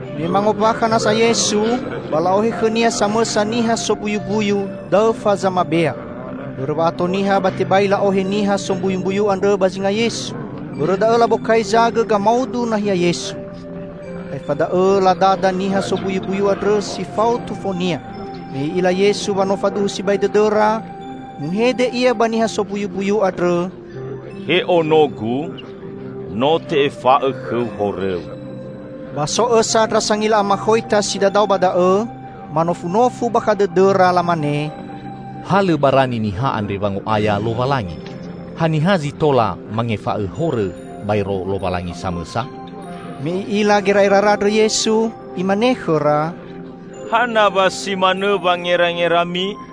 Me mangombakha nasa Yesu, ba la'ohe khõ-Nia samõsa niha sombuyumbuyu, daõfa zamabea. Bõrõ wa'ato niha ba tebai la'ohe niha sombuyumbuyu andrõ ba zinga Yesu. Bõrõ da'õ labokai zagõ gamaudu nahia Yesu. Aefa da'õ ladada niha sombuyumbuyu andrõ si fao tufonia. Me I'ila Yesu wa no faduhu sibai dõdõra, muhede Ia ba niha sombuyumbuyu andrõ, "He ono-Gu, no te'efa'õ khõu horõu." Ba so õsa ndra sangila amakhoita si dadao ba da'õ, manofunofu bakha dõdõra, lamane, "Ha lõ barani niha andre wango'aya Lowalangi! Haniha zi tola mangefa'õ horõ, baero Lowalangi samõsa!" Me I'ila gera'erara andrõ Yesu, Imane khõra, "Hana wa si manõ wangerangerami?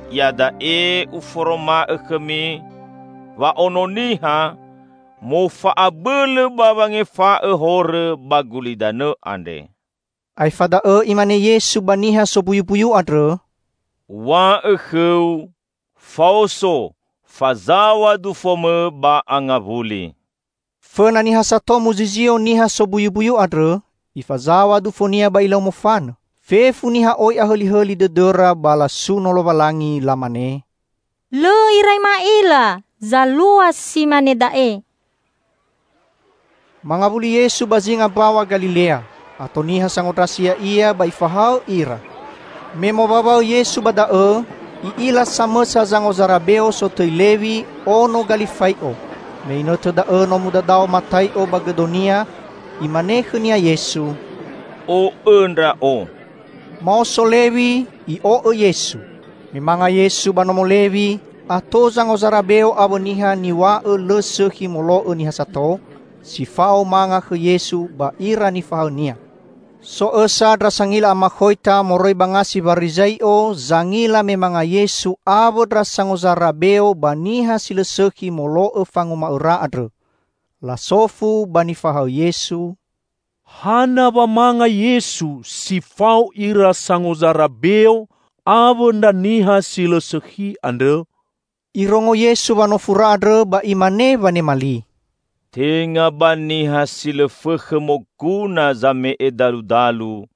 Iada'e Uforoma'õ khõmi wa Ono Niha, mofa'abõlõ ba wangefa'õ horõ ba gulidanõ andre." Aefa da'õ Imane Yesu ba niha sombuyumbuyu andrõ, "Uw̃a'õ khõu, faoso, fazaw̃a dufomõ ba angawuli!" Fõna niha sato muzizio niha sombuyumbuyu andrõ, ifazaw̃a dufonia ba ilau mofanõ. Fefu niha oi ahõlihõli dõdõra ba lasuno Lowalangi. Lamane, "Lõ irai ma'ila zalua si mane da'e!" Mangawuli Yesu ba zinga Mbaw̃a Galilea. Ato niha sangondrasi Ya'ia ba Ifahaõ ira. Me mowaõwaõ Yesu ba da'õ, I'ila samõsa zangozara beo sotõi Lewi, ono Galifai'o. Me inõtõ da'õ no mudadao Matai'o ba gõdonia. Imane khõnia Yesu, "O'õ Ndra'o!" Maoso Lewi, i'o'õ Yesu. Me manga Yesu ba nomo Lewi, ato zangozara beo awõ niha niw̃a'õ lõ sõkhi molo'õ niha sato, si fao manga khõ Yesu ba ira nifahaõ-Nia. So õsa ndra sangila amakhoita moroi ba ngasi Warizai'o zangila me manga Yesu awõ ndra sangozara beo ba niha si lõ sõkhi molo'õ fanguma'õra andrõ. Lasofu ba nifahaõ Yesu, "Hana wa manga Yesu si fao ira sangozara beo awõ ndra niha si lõ sõkhi andrõ?" Irongo Yesu wanofura andrõ ba Imane wanema li, "Tenga ba niha si lõ fõkhõ moguna zame'e daludalu,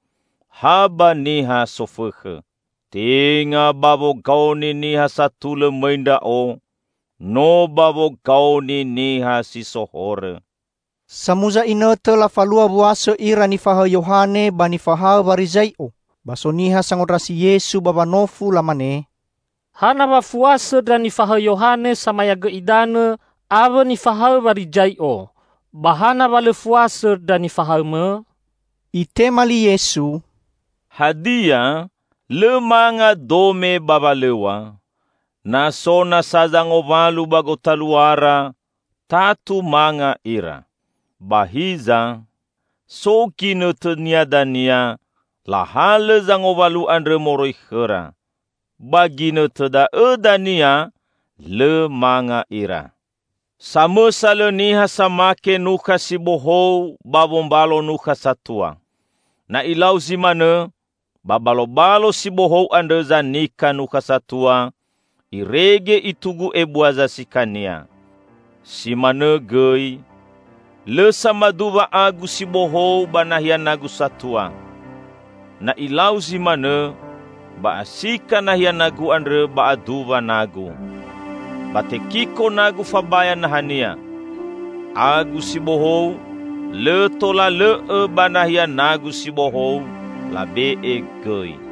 ha ba niha sofõkhõ. Tenga ba wogaoni niha satulõ mõi Ndra'o, no ba wogaoni niha si so horõ." Samuza inõtõ lafalua wuasõ ira nifahaõ Yohane ba nifahaõ Warizai'o. Ba so niha sangondrasi Yesu ba wanofu, lamane, "Hana wa fuasõ ndra nifahaõ Yohane Samayagõ Idanõ awõ nifahaõ Warizai'o, ba hana wa lõ fuasõ ndra nifahaõ-Mõ?" Itema li Yesu, "Hadia, lõ manga dome ba walõw̃a? Na so nasa zangowalu ba gotaluara, tatu manga ira. Ba hiza so ginõtõnia dania lahalõ zangowalu andrõ moroi khõra. Ba ginõtõ da'õ dania lõ manga ira. Samõsa lõ niha samake nukha si bohou ba wombalo nukha satua. Na ilau zi manõ, ba balobalo si bohou andrõ zanika nukha satua, irege itugu ebua zasikania. Si manõ gõi, lõ samaduwa agu si bohou ba nahia nagu satua. Na ilau zi manõ, ba asika nahia nagu andrõ ba aduwa nagu. Ba tekiko nagu fabaya nahania. Agu si bohou lõ tola lõ'õ ba nahia nagu si bohou labe'e gõi!"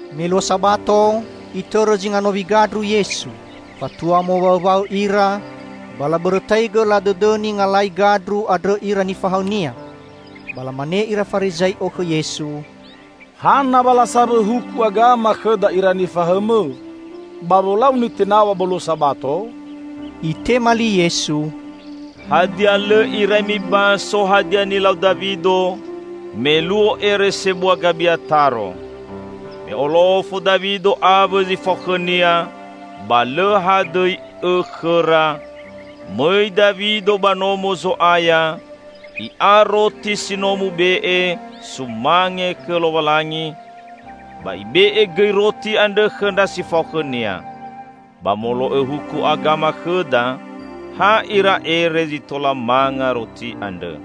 Me luo Sabato, Itõrõ zinga nowi gandru Yesu. Fatua mowaõwaõ ira, ba labõrõtaigõ ladõdõni ngalai gandru andrõ ira nifahaõ-Nia. Ba lamane ira Farizai'o khõ Yesu, "Hana wa lasawõ huku agama khõda ira nifahaõ-Mõ, ba wolau nitenaw̃a ba luo Sabato?" Itema li Yesu, "Hadia lõ irai mibaso hadia nilau Dawido, me luo ere sebua Gabiataro. Me olofo Dawido awõ zi fao khõnia, ba lõ hadõi õ khõra, mõi Dawido ba Nomo Zo'aya, i'a roti si no mube'e sumange khõ Lowalangi. Ba ibe'e gõi roti andrõ khõ ndra si fao khõnia. Ba molo'õ huku agama khõda, ha ira ere zi tola manga roti andrõ."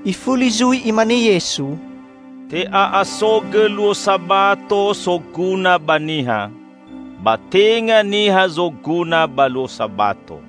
Ifuli zui Imane Yesu, "Te'a'asogõ luo Sabato soguna ba niha; ba tenga niha zoguna ba luo Sabato.